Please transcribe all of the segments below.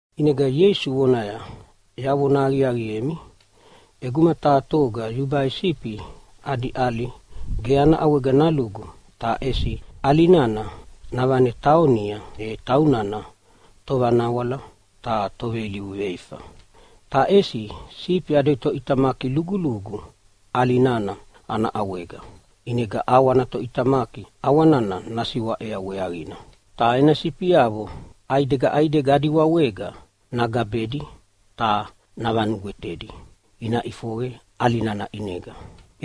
ʼInega Ieisu vonaya, “Yavona aqiaqiemi, ʼeguma taha toga yubai sifi adi ʼali ge ana ʼawega nalugu ta ʼesi ana ʼali nana navane taonia, e taunana tovanawala ta toveilivu veifa. Ta ʼesi sifi adi toʼitamaki lugulugu ʼali nana ana ʼawega. ʼInega ʼawa ana toʼitamaki ʼawa nana nasiwaʼea weaqina. Ta ena sifiavo ʼaidega ʼaidega adi wawega nagabedi ta navanugwetedi ina ʼifoqe ʼali nana ʼinega.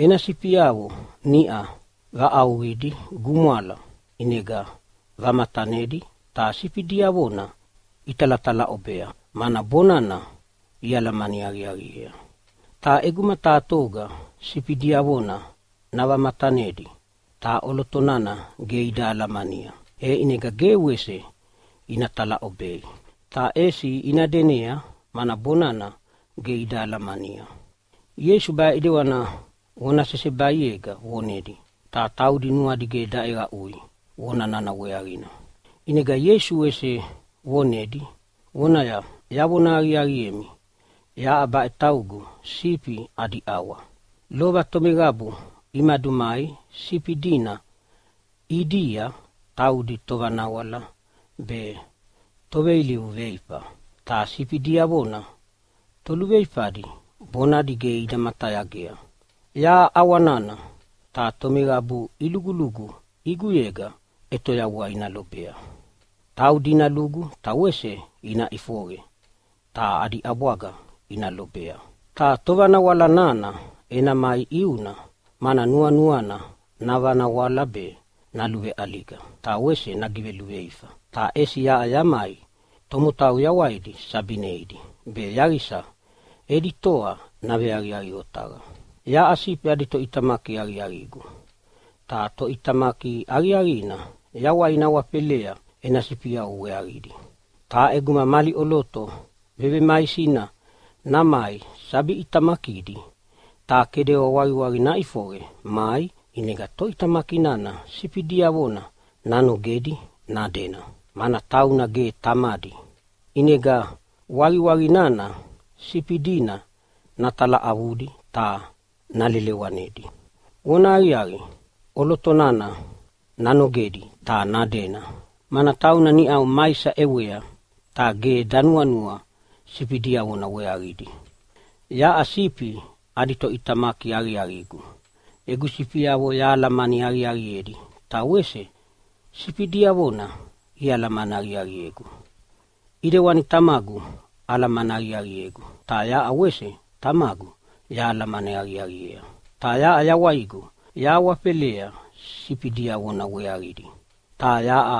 Ena sifiavo niʼa vaʼauʼauqidi gumwala, ʼinega vavamatanedi ta sifi diavona italatalaʼobea, mana bonana ialamani aqiaqiea. Ta ʼeguma taha toga sifi diavona navamatanedi ta ʼoloto nana ge ida alamania, e ʼinega ge wese ina talaʼobei, ta ʼesi ina denea, mana bonana ge ida alamania.” Ieisu baʼe ʼidewani vona sesebaiega vonedi, ta taudi nuadi ge daʼeqaʼui vona nana weaqina. ʼInegana Ieisu wese vonedi vonaya, “Yavona aqiaqiemi, yaʼa baʼe taugu sifi adi ʼawa. Lova tomeqabu imadumai sifi dina ʼidia taudi tovanawala be toveilivu veifa, ta sifi diavona toluveifadi bonadi ge ida matayagea. Yaʼa ʼawa nana, ta tomeqabu ilugulugu ʼiguyega ʼetoyavua ina lobea. Taudi ina lugu ta wese ina ʼifoqe, ta adi ʼabwaga ina lobea. Ta tovanawala nana ena mai ʼiuna, mana nuanuana navanawala be, naluveʼaliga ta wese nagiveluveifa. Ta ʼesi yaʼa yamai tomotau yawaidi sabi neidi be yaqisa edi toa naveaqiaqi otaqa. “Yaʼa sifi adi toʼitamaki aqiaqigu. Ta toʼitamaki aqiaqina yawaina awafelea ena sifiavo weaqidi. Ta ʼeguma mali ʼoloto vevemaisina namai sabi ʼitamakidi ta kedewa waqiwaqi naʼifoqe mai, ʼinega toʼitamaki nana sifi diavona nanogedi nadena, mana tauna ge tamadi. ʼInega waqiwaqi nana sifi dina natalaʼavudi ta nalelewanedi. Vonahaqiaqi, ʼoloto nana nanogedi ta nadena, mana tauna niʼa maisa ʼewea ta ge danuanua sifi diavona weaqidi. “Yaʼa sifi adi toʼitamaki aqiaqigu. Egu sifiavo yahalamani aqiaqiedi, ta wese sifi diavona ialamani aqiaqiegu, ʼidewani Tamagu alamani aqiaqiegu, ta yaʼa wese Tamagu yahalamani aqiaqiea. Ta yaʼa yawaigu yahawafelea sifi diavona weaqidi. Ta yaʼa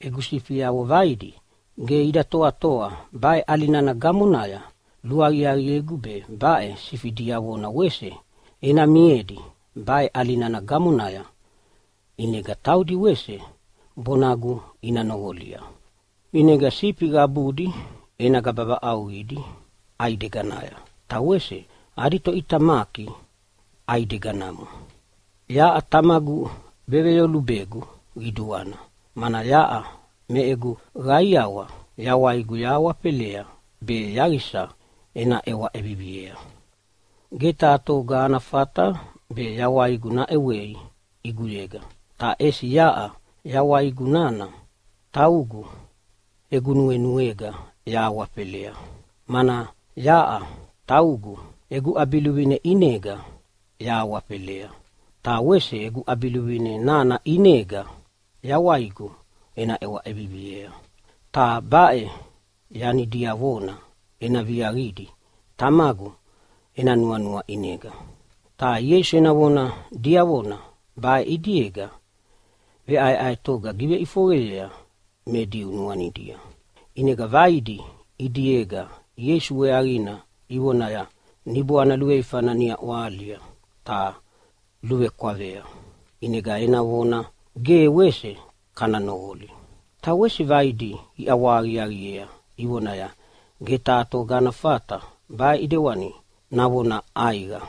egu sifiavo vaidi ge ida toatoa baʼe ʼali nana gamonaya. Luaqiaqiegu be baʼe sifi diavona wese ena miedi baʼe ʼali nana gamonaya, ʼinega taudi wese bonagu ina noqolia. ʼInega sifi qabudi ena gaba vaʼauqidi ʼaideganaya, ta wese adi toʼitamaki ʼaideganamo. “Yaʼa Tamagu veveyolubegu qiduana, mana yaʼa me egu qaiawa yawaigu yahawafelea be yaqisa ena ʼewa ʼeviviea. Ge taha toga ana fata be yawaigu naʼewei ʼiguyega. Ta ʼesi yaʼa yawaigu nana taugu egu nuenuega yahawafelea. Mana yaʼa taugu egu ʼabiluvine ʼinega yahawafelea, ta wese egu ʼabiluvine nana ʼinega yawaiguna ena ʼewa ʼeviviea. Ta baʼe yani diavona ena viaqidi Tamagu ena nuanua ʼinega.” Ta Ieisu ena vona diavona baʼe ʼidiega veʼaeʼaetoga giveʼifoqeyea me Diu nuanidia. ʼInega vaidi ʼidiega Ieisu weaqina ivonaya, “Niboana luveifana niʼa ʼwahalia ta luvekwavea. ʼInega ena vona ge wese kana noqoli!” Ta wese vaidi iʼawahaqiaqiea ivonaya, “Ge taha toga ana fata baʼe ʼidewani navona ʼaiqa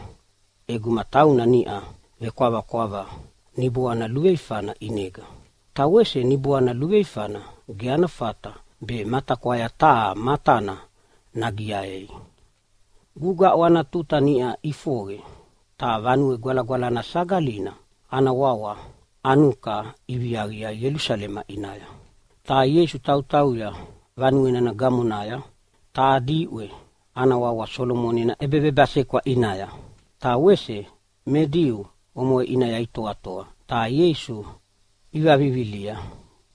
ʼeguma tauna niʼa vekwavakwava niboana luveifana ʼinega. Ta wese niboana luveifana ge ana fata be matakwaya taha matana nagiaei!” Gugaʼu ana tuta niʼa ʼifoqe, ta Vanue Gwalagwalana Sagalina ana wawa Anuka iviaqia Ielusalema ʼinaya. Ta Ieisu tautauya vanue nana gamonaya taha diʼwe ana wawa Solomoni ena ʼEbevebasekwa ʼinaya. Ta wese me Diu omoʼe ʼinaya itoatoa ta Ieisu ivavivilia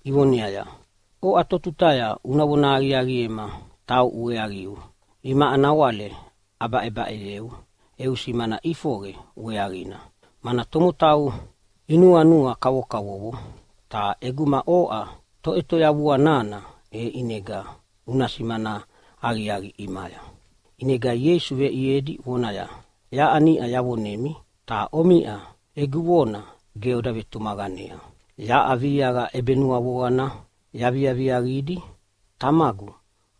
ivoneaya, “Oʼa totutaya una vona aqiaqiema tauʼu weaqiu? Imaʼa nawale abaʼebaʼeyeu eu simana ʼifoqe weaqina, mana tomotau inuanua kavokavovo. Ta ʼeguma oʼa Toʼetoyavua nana, e ʼinega una simana aqiaqi ʼimaya!” ʼInega Ieisu veʼiedi vonaya, “Yaʼa niʼa yavonemi, ta omiʼa egu vona ge oda vetumaqanea. Yaʼa viaqa ʼebenuavoqana yaviaviaqidi Tamagu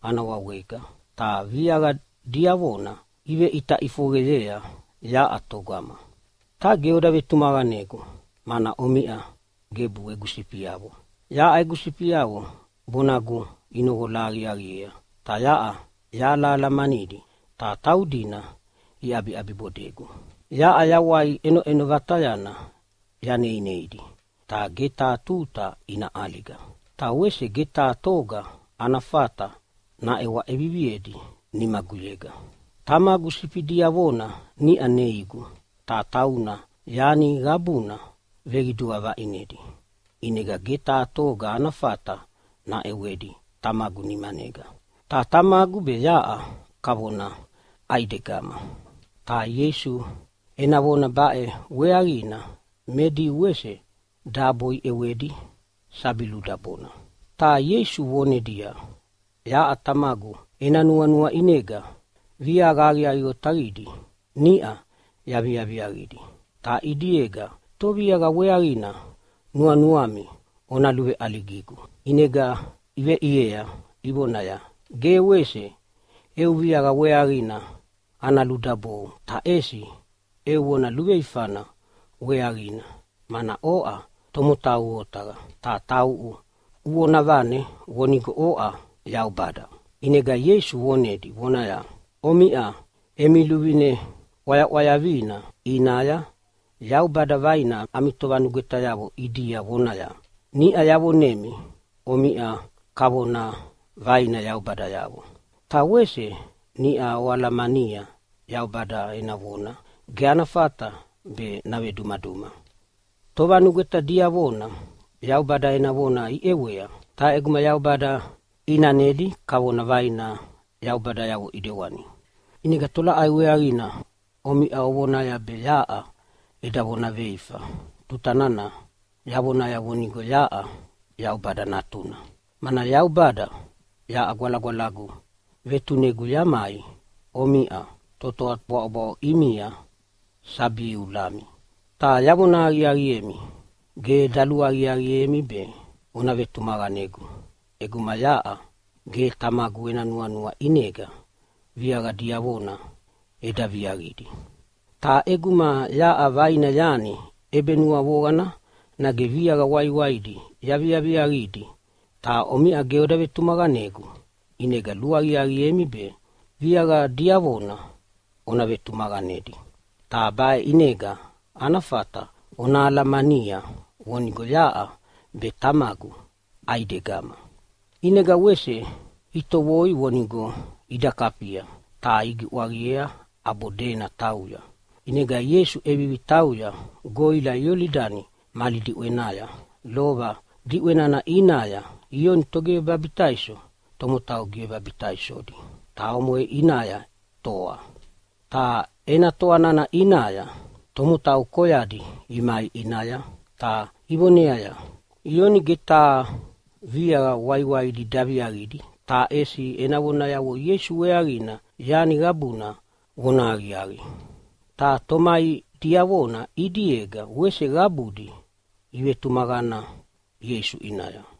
ana wawega, ta viaqa diavona iveʼita ʼifoqeyea yaʼa togama. Ta ge oda vetumaqanegu, mana omiʼa gebu egu sifiavo. Yaʼa egu sifiavo bonagu inoqola aqiaqiea, ta yaʼa yahalahalamanidi, ta taudina iʼabiʼabibodegu. Yaʼa yawai ʼenoʼeno vatayana yaneineidi, ta ge taha tuta ina ʼaliga. Ta wese ge taha toga ana fata naʼewa ʼeviviedi nimaguyega. Tamagu sifi diavona niʼa neigu, ta tauna yani qabuna veqidua vaʼinedi, ʼinega ge taha toga ana fata naʼewedi Tamagu nimanega. Ta Tamagu be yaʼa kavona ʼaidegama.” Ta Ieisu ena vona baʼe weaqina me Diu wese dabo iʼewedi sabi ludabona. Ta Ieisu vonedia, “Yaʼa Tamagu ena nuanua ʼinega viaqa aqiaqi otaqidi niʼa yaviaviaqidi. Ta ʼidiega, toviaqa weaqina nuanuami ona luveʼaligigu?” ʼInega iveʼiea ivonaya, “Ge wese eu viaqa weaqina ana ludabou, ta ʼesi eu vona luveifana weaqina, mana oʼa tomotau otaqa, ta tauʼu uvonavane vonigo oʼa Yaubada.” ʼInega Ieisu vonedi vonaya, “Omiʼa emi luvine ʼwayaʼwayavina ʼinaya Yaubada vaina ami tovanugwetayavo ʼidia vonaya, ‘Niʼa yavonemi omiʼa kavona vaina yaubadayavo.’ Ta wese niʼa oalamania Yaubada ena vona ge ana fata be navedumaduma. Tovanugweta diavona Yaubada ena vona iʼewea, ta ʼeguma Yaubada ʼinanedi kavona vaina yaubadayavo ʼidewani, ʼinega tolaʼai weaqina omiʼa ovonaya be yaʼa eda vonaveifa tuta nana yavonaya vonigo yaʼa Yaubada Natuna? Mana Yaubada yaʼa Gwalagwalagu vetunegu yamai omiʼa totoa bwaʼobwaʼo ʼimia sabi iulami. Ta yavona aqiaqiemi, ge daluaqiaqiemi be ona vetumaqanegu ʼeguma yaʼa ge Tamagu ena nuanua ʼinega viaqa diavona eda viaqidi. Ta ʼeguma yaʼa vaina yani ʼebenuavoqana nage viaqa waiwaidi yaviaviaqidi ta omiʼa ge oda vetumaqanegu, ʼinega luaqiaqiemi be viaqa diavona ona vetumaqanedi. Ta baʼe ʼinega ana fata ona alamania vonigo yaʼa be Tamagu ʼaidegama.” ʼInega wese itovoi vonigo ida kafia, ta igiʼwaqiea ʼabo dena tauya. ʼInega Ieisu ʼevivi tauya goʼila Iolidani mali diʼwenaya, lova diʼwe nana ʼinaya Ioni Togivebabitaiso tomotau givebabitaisodi, ta omoʼe ʼinaya toa. Ta ena toa nana ʼinaya tomotau koyadi imai ʼinaya ta ivoneaya, “Ioni ge taha viaqa waiwaidi daviaqidi, ta ʼesi ena vonayavo Ieisu weaqina yani qabuna vonahaqiaqi.” Ta tomai diavona ʼidiega wese qabudi ivetumaqana Ieisu ʼinaya.